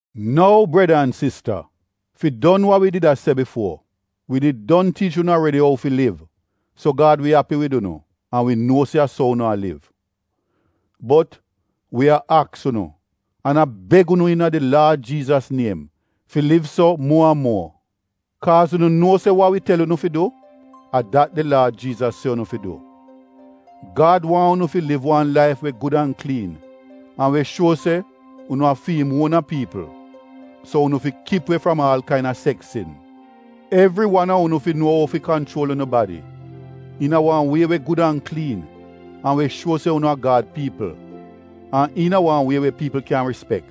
Nou, breda an sista, fi don wa wi did a se bifuo: wi did don tiich unu aredi ou fi liv so Gad wi api wid unu (an wi nuo se a so unu a liv). Bot, wi a aks unu, an a beg unu iina di Laad Jiizas niem fi liv so muo an muo. Kaaz unu nuo se wa wi tel unu fi du, a dat di Laad Jiizas se unu fi du. Gad waahn unu fi liv wan laif we gud an kliin an we shuo se unu a fi im uona piipl, so unu fi kip we fram aal kaina seks sin. Evri wan a unu fi nuo ou fi kanchuol unu badi iina wan wie we gud an kliin an we shuo se unu a Gad piipl, an iina wan wie we piipl kyan rispek.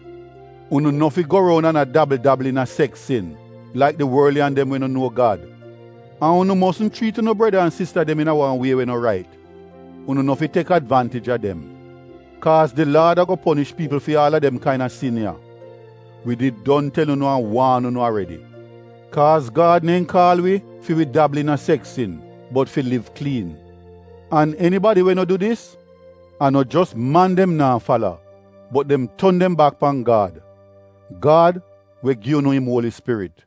Unu no fi go roun an a dabl-dabl iina seks sin laik di worliyan dem we no nuo Gad. An unu mosn chriit unu breda an sista dem iina wan wie we no rait. Unu no fi tek advaantij a dem. Kaaz di Laad ago ponish piipl fi aal a dem kaina sin ya. Wi did don tel unu an waan unu aredi. Kaaz Gad neehn kaal wi fi wi dabl iina seks sin, bot fi liv kliin. An enibadi we no du dis, a no jos man dem naa fala bot dem ton dem bak pan Gad — Gad, we gi unu im Uoli Spirit.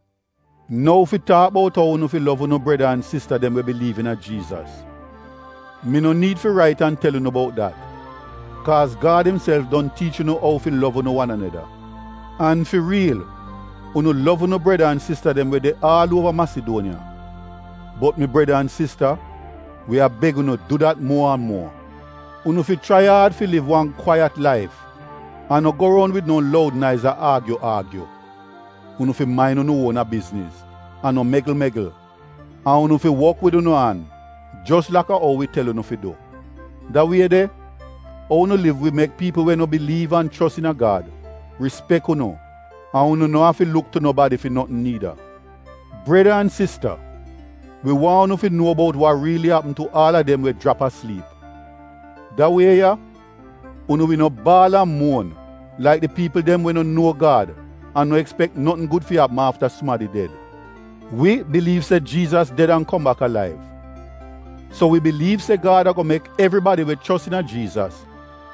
Nou fi taak bout ou unu fi lov unu breda an sista dem we biliiv iina Jiizas, mi no niid fi rait an tel unu bout dat, kaaz Gad imself don tiich unu ou fi lov unu wan aneda. An fi riil unu lov unu breda an sista dem we de aal uova Masiduoniya. Bot mi breda an sista, wi a beg unu du dat muo an muo. Unu fi chrai aad fi liv wan kwaiyat laif an no go roun wid no loud naiz a aagyu-aagyu. Unu fi main unu uona bizniz an no megl-megl. An unu fi wok wid unu an, jos laka ou wi tel unu fi du. Da wie de, ou unu liv wi mek piipl we no biliiv an chos iina Gad rispek unu an unu no afi luk tu nobadi fi notn niida. Breda an sista, wi waahn unu fi nuo bout wa riili apm tu aal a dem we jrap asliip. Da wie ya unu wi no baal an muon laik di piipl dem we no nuo Gad an no ekspek notn gud fi apm afta sumadi ded. Wi biliiv se Jiizas ded an kom bak alaiv, so wi biliiv se Gad ago mek evribadi we chos iina Jiizas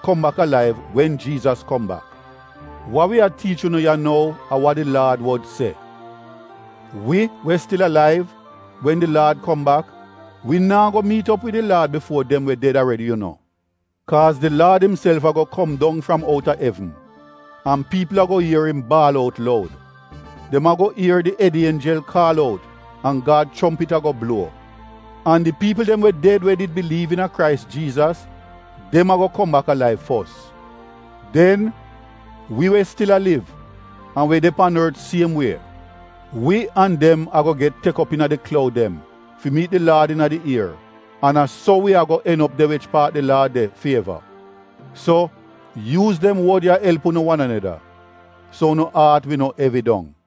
kom bak alaiv wen Jiizas kom bak. Wa wi a tiich unu ya nou a wa di Laad wod se. Wi we stil alaiv, wen di Laad kom bak wi naa go miit op wid di Laad bifuo dem we ded aredi yu no. Kaaz di Laad imself ago kom dong fram outa evn, an piipl ago ier im baal out loud. Dem ago ier di ed ienjel kaal out an Gad chompit ago bluo. An di piipl dem we ded we did biliiv iina Krais Jiizas, dem ago kom bak alaiv fos. Den aal av a sodn, wi we stil a liv, an we de pan ort siem wie, wi an dem ago get tek op iina di kloud dem fi miit di Laad iina di ier an a so wi ago en op de wich paat di Laad de fi eva. So, yuuz dem wod ya elp unu wan aneda, so unu aat wi no evi dong.